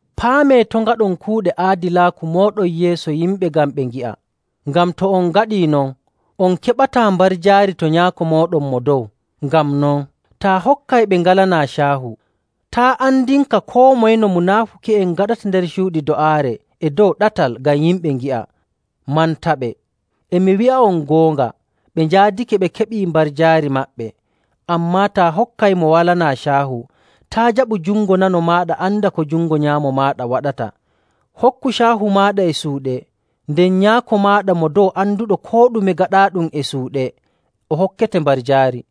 “Paamee to' ngaɗon kuuɗe aadilaaku mooɗon yeeso yimɓe ngam ɓe ngi'a. Ngam to on ngaɗii non, on keɓataa mbarjaari to Nyaako mooɗon Mo Dow.. “Ngam non, taa hokkay ɓe ngalanaa caahu, taa' andinka koo moye no munaafuki'en ngaɗata nder cuuɗi do'aare e dow ɗatal ngam yimɓe ngi'a mantaɓe. E mi wi'a'on goonga, ɓe njaadake ɓe keɓi mbarjaari maɓɓe. Ammaa taa hokkay mo walanaa caahu, taa' jaɓu jungo nano maaɗa anda ko jungo nyaamo maaɗa waɗata. Hokku caahu maaɗa e suuɗe, nden Nyaako maaɗa Mo Dow anduɗo koo ɗume gaɗaaɗum e suuɗe, o hokkete mbarjaari.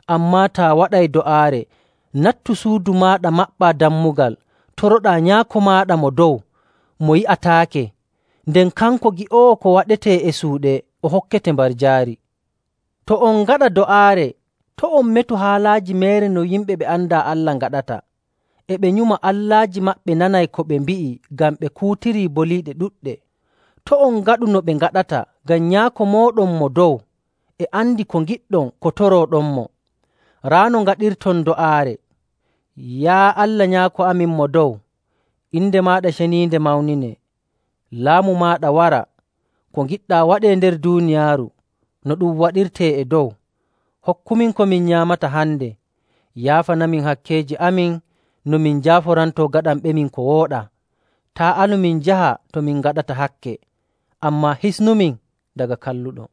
Ammaa taa waɗay do'aare, nattu suudu maaɗa maɓɓaa dammugal, toroɗaa Nyaako maaɗa Mo Dow mo yi'ataake. Nden kanko gi'oowo ko waɗetee e suuɗe o hokkete mbarjaari. “To on ngaɗa do'aare, to' on metu haalaaji meere no yimɓe ɓe andaa Allah ngaɗata. E ɓe nyuma allaaji maɓɓe nanay ko ɓe mbi'i ngam ɓe kuutiri boliiɗe ɗuɗɗe. To' on ngaɗu no ɓe ngaɗata ngam Nyaako mooɗon Mo Dow e andi ko ngiɗɗon ko torooɗonmo. Raa no ngaɗirton do'aare, ‘Yaa Allah Nyaako amin Mo Dow, inde maaɗa ceniinde mawninee. Laamu maaɗa wara, ko ngiɗɗaa waɗee nder duuniyaaru, no ɗum waɗirtee e dow. Hokkumin ko min nyaamata hande. Yaafanamin hakkeeji amin no min njaaforantoo gaɗanɓemin ko wooɗaa. Taa' alu min njaha to min ngaɗata hakke, ammaa hisnumin daga Kalluɗo.’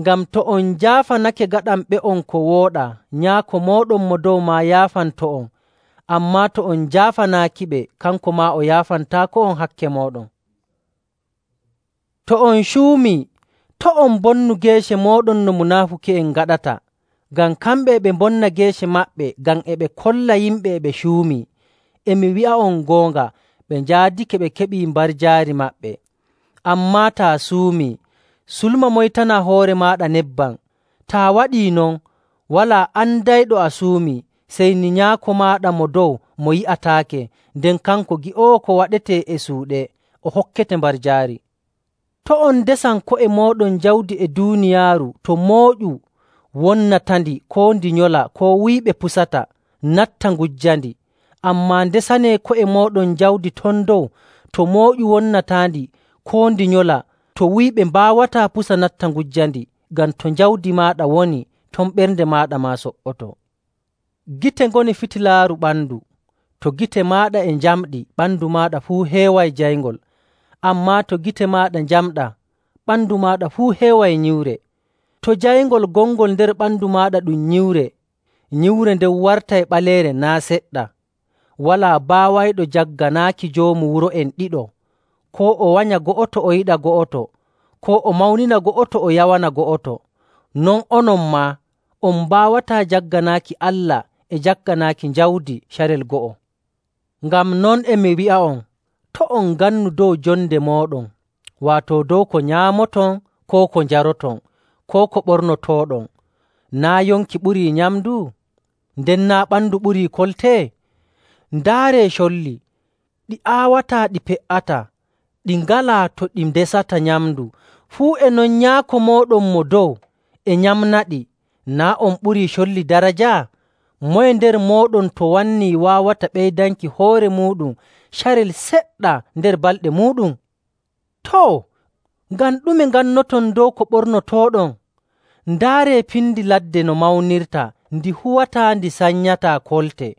“Ngam to on njaafanake gaɗanɓe'on ko wooɗaa, Nyaako mooɗon Mo Dow maa yaafanto'on. Ammaa to on njaafanaakiɓe, kanko maa o yaafantaako'on hakke mooɗon.. “To on cuumii, to' on mbonnu geece mooɗon no munaafuki'en ngaɗata, ngam kamɓe e ɓe mbonna geece maɓɓe ngam ɓe kolla yimɓe e ɓe cuumii. E mi wi'a'on goonga, ɓe njaadake ɓe keɓii mbarjaari maɓɓe. Ammaa taa suumii, sulma, moytanaa hoore maaɗa nebbam. Taa waɗii non, walaa andayɗo a suumii, sey ni Nyaako maaɗa Mo Dow mo yi'ataake. Nden kanko gi'oowo ko waɗetee e suuɗe, o hokkete mbarjaari. “To' on ndesan ko'e mooɗon jawdi e duuniyaaru to mooƴu wonnatandi, koo ndi nyola, koo to wuyɓe pusata natta ngujjandi.. Ammaa ndesanee ko'e mooɗon jawdi ton dow to mooƴu wonnataandi, koo ndi nyola, to wuyɓe mbaawataa pusa natta ngujjandi. Ngam to jawdi maaɗa woni, ton ɓernde maaɗa maa so''otoo. “Gite ngoni fitilaaru ɓandu. To gite maaɗa e njamɗi, ɓandu maaɗa fuu heeway jayngol. Ammaa to gite maaɗa njamɗaa, ɓandu maaɗa fuu heeway nyiwre. To jayngol gongol nder ɓandu maaɗa ɗum nyiwre, nyiwre nden wartay ɓaleere naa' seɗɗa. “Walaa baawayɗo jagganaaki joomu wuro'en ɗiɗo. Koo o wanya go'oto o yiɗa go'oto, koo o mawnina go'oto o yawana go'oto. Non onon maa, on mbaawataa jagganaaki Allah e jagganaaki jawdi carel go'o. “Ngam non, e mi wi'a'on, to' on ngannu dow jonde mooɗon, waato dow ko nyaamoton, koo ko njaroton, koo ko ɓornotooɗon. Naa' yonki ɓurii nyamndu? Nden naa' ɓandu ɓurii kolte? Ndaaree colli! Ɗi aawataa, ɗi pe''ataa, ɗi ngalaa to ɗi ndesata nyamndu. Fuu e non Nyaako mooɗon Mo Dow e nyamnaɗi. Naa' on ɓurii colli daraja? Moye nder mooɗon to wannii waawata ɓeydanki hoore muuɗum carel seɗɗa nder balɗe muuɗum? “Too, ngam ɗume ngannoton dow ko ɓornotooɗon? Ndaaree pindi ladde no mawnirta, ndi huwataa, ndi sanyataa kolte.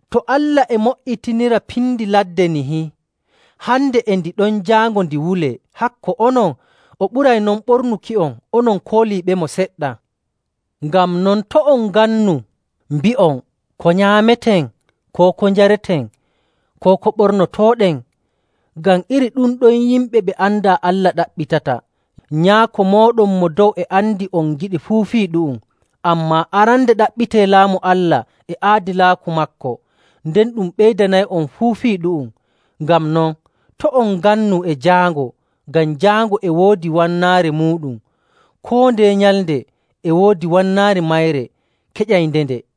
To Allah e mo''itinira pindi ladde nihi, hande e ndi ɗon, jaango ndi wulee, hakko onon, o ɓuray non ɓornuki'on, onon kooliiɓemo seɗɗa! “Ngam non, to' on ngannu mbi'on, ‘Ko nyaameten?’, koo ‘Ko njareten?’, koo ‘Ko ɓornotooɗen?’ Ngam iri ɗum ɗon yimɓe ɓe andaa Allah ɗaɓɓitata. Nyaako mooɗon Mo Dow e andi on ngiɗi fuu fii ɗu'um. Ammaa arande ɗaɓɓitee Laamu Allah e aadilaaku maako, nden ɗum ɓeydanay'on fuu fii ɗu'um. Ngam non, to' on ngannu e jaango, ngam jaango e woodi wannaare muuɗum. Koo ndeye nyalnde e woodi wannaare mayre keƴayndende.